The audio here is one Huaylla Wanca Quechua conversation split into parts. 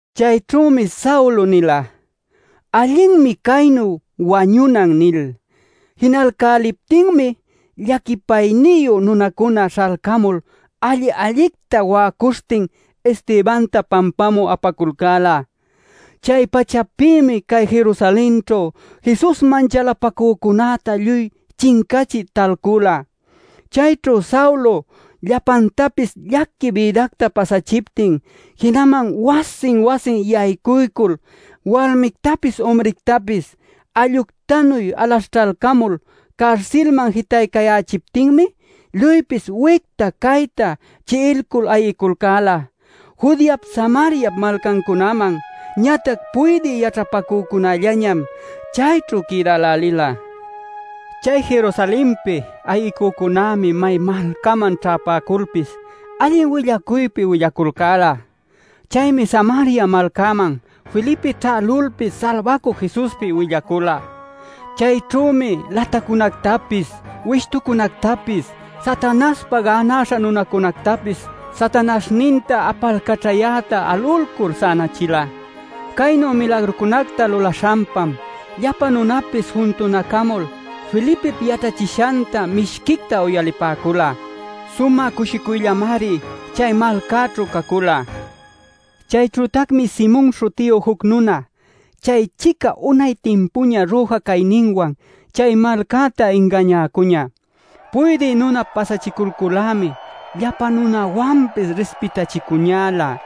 Chayćhümi Saulo nila: “Allinmi caynu wañunan” nil. Jinalcäliptinmi llaquipayniyu nunacuna śhalcamul alli-allicta wa'acuśhtin Estebanta pampamü apaculcäla. Chay-pachapïmi cay Jerusalenćhu Jesusman chalapacücunäta lluy chincachï talcula. Chayćhu Saulo llapantapis llaqui bïdacta pasachiptin, jinaman wasin wasin yaycuycul walmictapis umrictapis alluctanuy alaśhćhalcamul carsilman jitaycayächiptinmi lluypis wicta cayta chi'iculcul ayiculcäla Judeap Samariap malcancunaman. Ñatac puydï yaćhapacücunällañam chayćhu quïdälälila. Chay Jerusalenpi ayicücunämi may malcaman ćhäpäculpis allin willacuypi willaculcäla. Chaymi Samaria malcäman Felipe ćhälulpis Salbacü Jesuspi willacula. Chayćhümi latacunactapis, wishtucunactapis, Satanaśhpa gänaśha nunacunactapis Satanaśhninta apalcaćhayäta alulcul sänachila. Caynu milagrucunacta lulaśhanpam, llapa nunapis juntunacamul Felipip yaćhachishanta mishquicta uyalipäcula. Sumä cushicuyllamari chay malcäćhu cacula. Chayćhütacmi Simon śhutiyu juc nuna chay-chica unay timpuña rüja cayninwan chay malcäta ingañäcuñä. Puydï nunap pasachiculcul-lämi llapa nunawanpis rispitachicuñälä.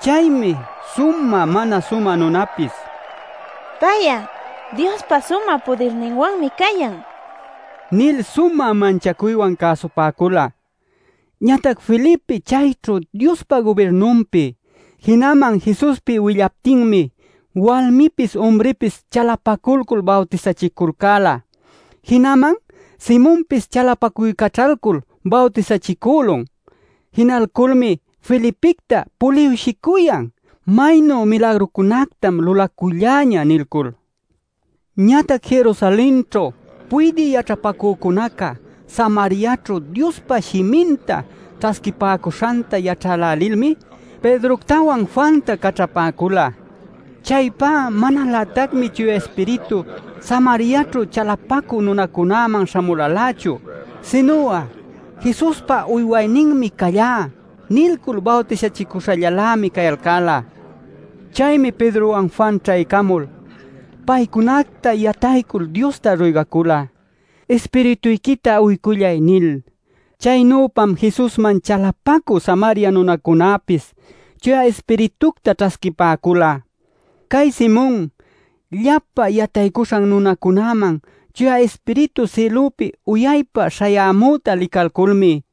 Chaymi sumä mana sumä nunapis “Pay'a Diospa sumä pudirninwanmi cayan” nil sumä manchacuywan cäsupäcula. Ñatac Felipe chayćhu Diospa gubirnunpi, jinaman Jesuspi willaptinmi walmipis umripis chalapaculcul bawtisachiculcäla. Jinaman Simonpis chalapacuycaćhalcul bawtisachicülun. Jinalculmi Felipicta puliwshicuyan “¡Maynu milagrucunactam lulaculläñä!” nilcul. Ñatac Jerusalenćhu puydï yaćhapacücunaca Samariaćhu Diospa shiminta ćhasquipäcuśhanta yaćhälälilmi Pedroctawan Juanta caćhapäcula. Chaypá manalätacmi Chuya Ispiritu Samariaćhu chalapacü nunacunäman śhamulalächu. Sinu'a “Jesuspa uywayninmi callá” nilcul bawtisachicuśhallalämi cayalcäla. Chaymi Pedrowan Juan ćhaycamul, paycunacta yataycul Diosta ruygacula “Ispirituyquita uycullay” nil. Chaynüpam Jesusman chalapacü Samaria nunacunäpis Chuya Ispiritucta ćhasquipäcula. Cay Simon llapa yataycuśhan nunacunäman Chuya Ispiritu sïlupi uyaypa śhayämüta licalculmi,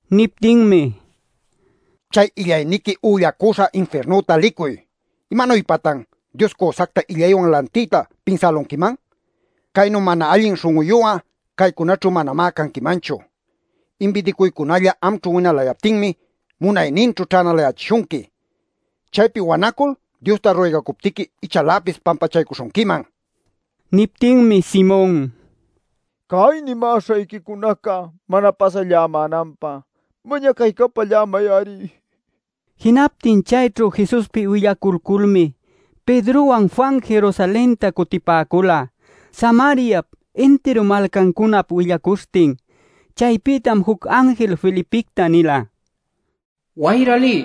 Niptinmi: “Chay illayniqui üllacüśha infirnüta licuy. ¿Imanuypatan Dios cüsacta illaywan lantiyta pinsälunquiman? Caynu mana allin śhun'uyu'a caycunaćhu manamá canquimanchu. Inbidicuycunalla amćhu winalayaptinmi munayninćhu ćhänalayächishunqui. Chaypi wanacul Diosta ruygacuptiqui ichaläpis pampachaycuśhunquiman” nin. Niptinmi Simon: “Cay nimäśhayquicunaca mana pasallämänanpä mañacaycapallämay-ari” nicuyan. Jinaptin chayćhu Jesuspi willaculculmi Pedrowan Juan Jerusalenta cutipäcula Samariap intiru malcancunap willacuśhtin. Chaypïtam juc anjil Felipicta nila: “Wayra liy,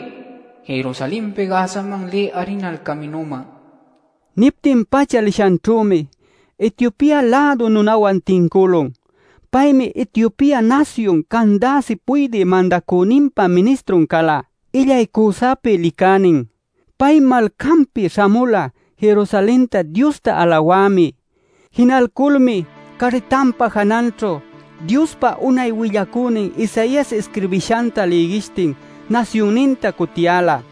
Jerusalenpi Gazaman lï arinal caminüman” nil. Niptin-pacha lishanćhümi Etiopia-lädu nunawan tincülun. Paymi Etiopia nasyun Candace puydï mandacüninpa ministrun cala illay cüsapi licänin. Pay malcanpi śhamula Jerusalenta Diosta alawämi. Jinalculmi carritanpa jananćhu Diospa unay willacünin Isaias isquirbishanta lïgishtin nasyunninta cutiyäla.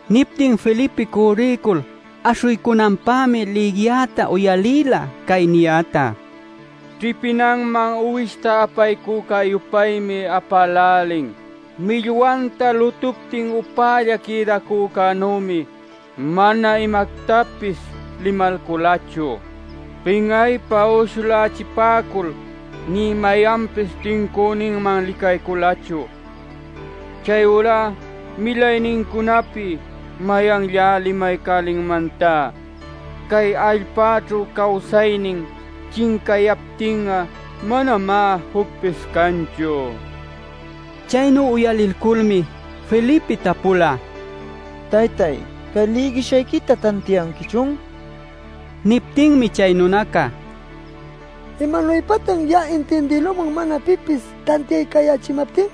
Niptin Felipe cürriycul aśhuycunanpämi lïgiyäta uyalïla cay niyäta: “Ćhipinanman uwishta apaycuyä-yupaymi apälälin. Millwanta lutuptin upälla quïdacänümi, mana imactapis limalculachu. Pin'aypä uyshulächipäcul nï mayanpis tincüninman licayculachu. Chayurá milaynincunapi ¿mayanllá limaycälinmantá? Cay allpäćhu cawsaynin chincayaptin'a manamá jucpis canchu” nil. Chaynu uyalilculmi Felipe tapula: “Taytay, cay lïgishayquita ¿tantiayanquichun?” nil. Niptinmi chay nunaca: “¿Imanuypatan ya'a intindïlüman mana pipis tantiaycayächimaptin?”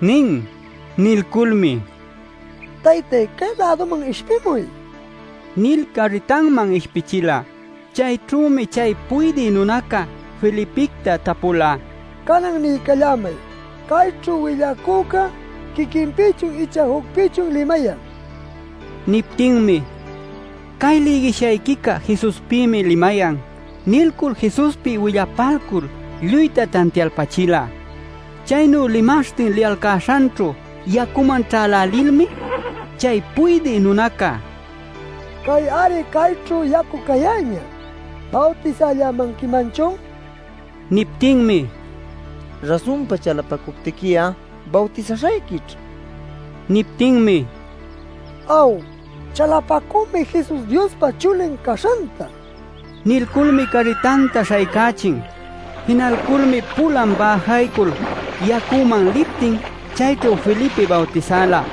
nin. Nilculmi: “Taytay, cay-läduman ishpimuy” nil carritanman ishpichila. Chayćhümi chay puydï nunaca Felipicta tapula: “Canan niycallämay ¿cayćhu willacüca quiquinpïchun icha jucpïchun limayan?” nil. Niptinmi: “Cay lïgishayquica Jesuspïmi limayan” nilcul Jesuspi willapalcul lluyta tantialpachila. Chaynu limaśhtin liyalcäśhanćhu yacuman ćhälälilmi chay puydï nunaca: “Cay-ari cayćhu yacu cayäñä; ¿Bawtisallämanquimanchun?” nila. ˻Niptinmi: “Rasunpa chalapacuptiqui'a, bawtisaśhayquićh” nin. Niptinmi: “Aw, chalapacümi Jesus Diospa Chulin caśhanta” nila.˼ Nilculmi carritanta śhaycächin. Jinalculmi pulan bäjaycul, yacuman liptin chayćhu Felipe bawtisala.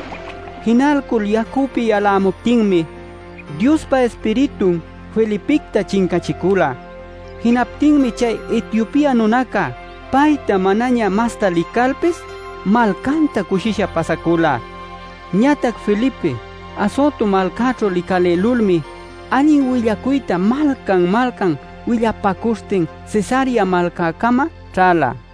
Jinalcul yacüpi yalayämuptinmi Diospa Ispiritun Felipicta chincachicula. Jinaptinmi chay Etiopia nunaca payta manaña masta licalpis malcanta cushisha pasacula. Ñatac Felipe Azoto malcaćhu licalïlulmi allin willacuyta malcan-malcan willapacuśhtin Cesarea malcäcama ćhäla.